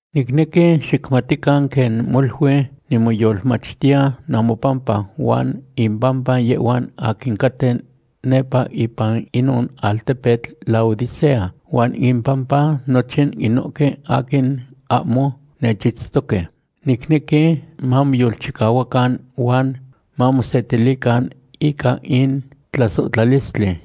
Nicnequi xicmatican quen molui nimoyolmachtiya namopampa huan impampa yehhuan aquin caten nepa ipan inon altepetl Laodicea huan impampa nochin inohque aquin ahmo nechitztoque. Nicnequi mamoyolchicahuacan huan mamosetilican ica in tlasohtlalistli.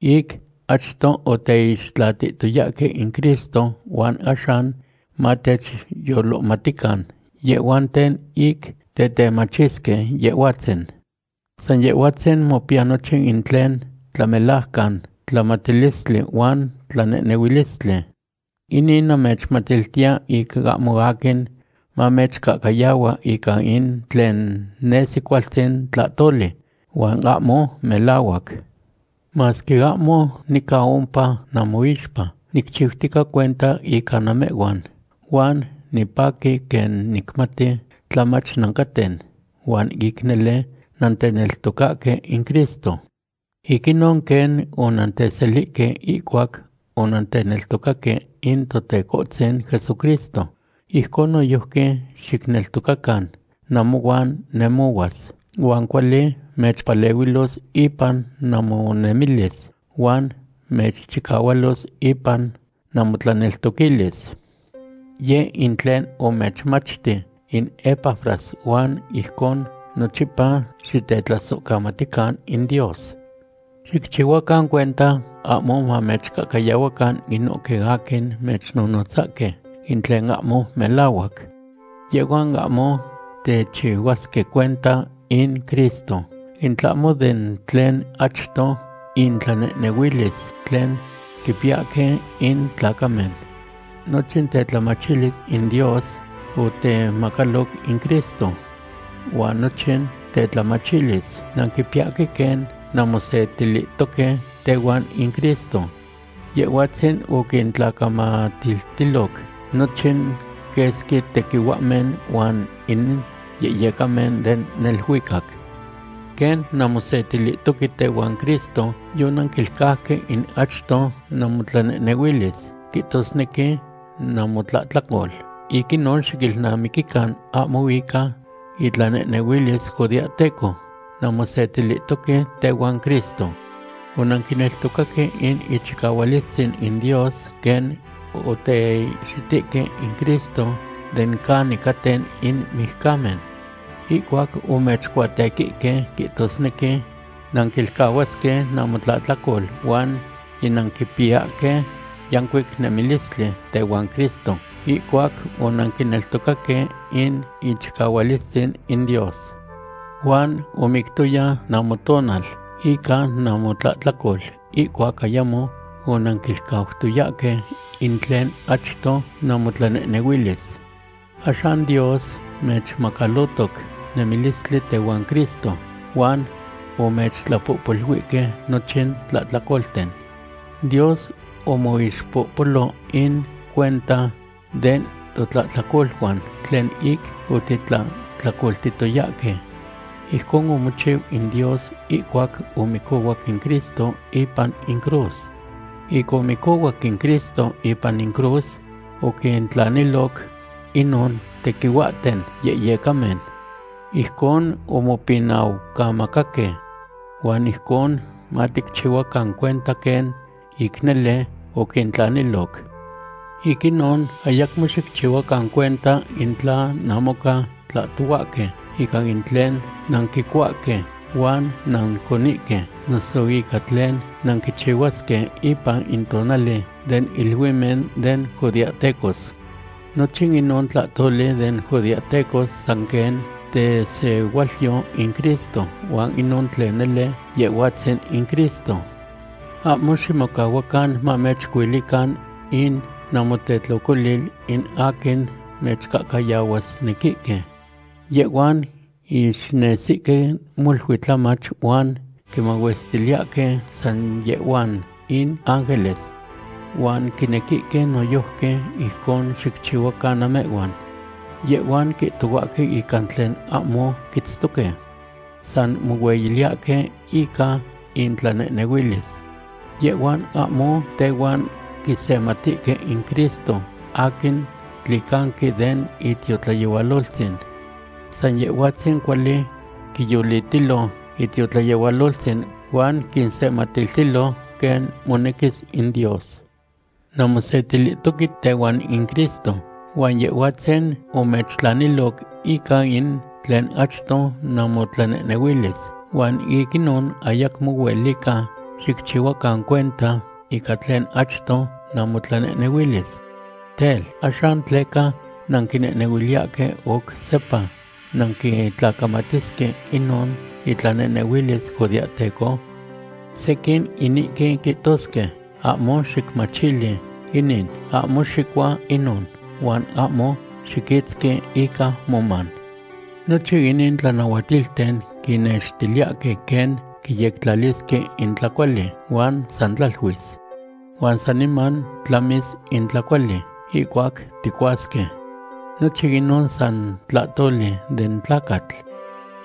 Ic achto oteixtlatihtoyahque in Cristo huan axan mateyolohmatican yehhuanten ic tetemachisque Yehhuatzin. San Yehhuatzin mopiya nochin in tlen tlamelajcan tlamatilistli huan tlanehnehuilistli. Inin namechmatiltiya ic ahmo aquin mamechcahcayahua ica in tlen nesi cualtzin tlahtoli huan ahmo melahuac. Masque ahmo nica ompa namoixpa, nicchiutica cuenta ica namehhuan, huan nipaqui quen nicmati tlamach nancaten huan ic nele nanteneltocahque in Cristo. Ic inon, quen onanteselihque ihcuac onanteneltocaque in Totecohtzin Jesucristo, ijcon noyojqui xicneltocacan namohuan nemohuas, huan cuali mechpalehuilos ipan namonemilis huan mechchicahualos ipan namotlaneltoquilis. Yeh in tlen omechmachti in Epafras huan ijcon nochipa xitetlasohcamatican in Dios. Xicchihuacan cuenta ahmo mamechcahcayahuacan inohque aquin mechnonotzasque in tlen ahmo melahuac. Yehhuan ahmo techihuasque cuenta in Cristo, in tlahmo den tlen achto intlanehnehuilis tlen quipiyahque in tlacamen. Nochin tetlamachilis in Dios otemacaloc in Cristo. Huan nochin tetlamachilis nanquipiyahque quen nanmosetilihtoque tehuan in Cristo. Yehhuatzin oquintlacamatiltiloc nochin quesqui tequihuahmen huan in yehyecamen den neluicac. Quen nanmosetilihtoque tehuan Cristo, yonanquilcauque in achto namotlanehnehuilis, quihtosnequi namotlahtlacol. Ic inon xiquilnamiquican ahmo ica itlanehnehuilis judeahteco nanmosetilihtoque tehuan Cristo. Onanquineltocaque in ichicahualistzin in Dios quen oteihxitihque in Cristo den canin caten in mijcamen. Ihcuac omechcuatequihque, quihtosnequi nanquilcahuasque namotlahtlacol huan yinanquipiyahque yancuic nemilistli tehuan Cristo ihcuac onanquineltocaque in ichicahualistzin in Dios. Huan omictoya namotonal ica namotlahtlacol ihcuac ayamo onanquilcautoyahque in tlen achto namotlanehnehuilis. Axan Dios mechmacalotoc nemilistli tehuan Cristo huan omechtlapohpoluihque nochin tlahtlacolten. Dios omoixpohpolo in cuenta den totlahtlacoluan tlen ic otitlahtlacoltihtoyahque. Ijcon omochiu in Dios ihcuac omicohuac in Cristo ipan in cruz. Ic omicohuac in Cristo ipan in cruz oquintlaniloc inon tequihuahten yehyecamen. Ijcon omopinaucamacaque. Huan ijcon maticchihuacan cuenta quen ic nele oquintlaniloc. Ic inon, ayacmo xicchihuacan cuenta in tla namoca tlahtohuahque ica in tlen nanquicuahque huan nanconihque, noso ica tlen nanquichihuasque ipan in tonali den iluimen den judeahtecos. Nochin inon tlahtoli den judeahtecos san quen tesehualyo in Cristo huan inon tlen nele, Yehhuatzin in Cristo. Ahmo ximocahuacan mamechcuilican in namotetlocolil in aquin mechcahcayahuasnequihque. Yehhuan ixnesihque molui tlamach huan quimahuestiliyahque san yehhuan in ángeles. Huan quinequihque noyojqui ijcon xicchihuacan namehhuan. Yehhhuan quihtohuahque ica tlen ahmo quitztoque. San mohueyiliyahque ica intlanehnehuilis. Yehhuan ahmo tehuan quisematihque in Cristo aquin tlicanqui den itiotlayehualoltzin. San Yehhuatzin cuali quiyolitilo itiotlayehualoltzin huan quinsematiltilo, quen monequis in Dios. Nanmosetilihtoque tehuan in Cristo, huan Yehhuatzin omechtlaniloc ica in tlen achto namotlanehnehuilis, huan ic inon ayacmo huelica xicchihuacan cuenta ica tlen achto namotlanehnehuilis. Tel, ¿axan tleca nanquinehnehuiliyahque oc sepa nanquitlacamatisque inon itlanehnehuilis judeahteco? Sequin inihque quihtosque: “Ahmo xicmachili inin, ahmo xicua inon, huan ahmo xiquitzqui ica moman.” Nochin inin tlanahuatilten quinnextiliyahque quen quiyectlalisque in tlacuali huan san tlaluis. Huan saniman tlamis in tlacuali ihcuac ticuasque. Nochin inon san tlahtoli den tlacatl.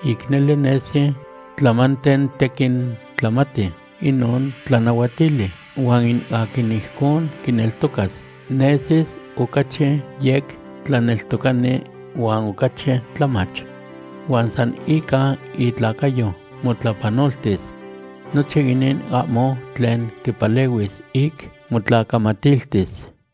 Ic nele nesi tlamanten tequin tlamati inon tlanahuatili, huan in aquin ijcon quineltocas nesis ocachi yec tlaneltocani huan ocachi tlamach. Huan san ica itlacayo motlapanoltis. Nochin inin ahmo tlen quipalehuis ic motlacamatiltis.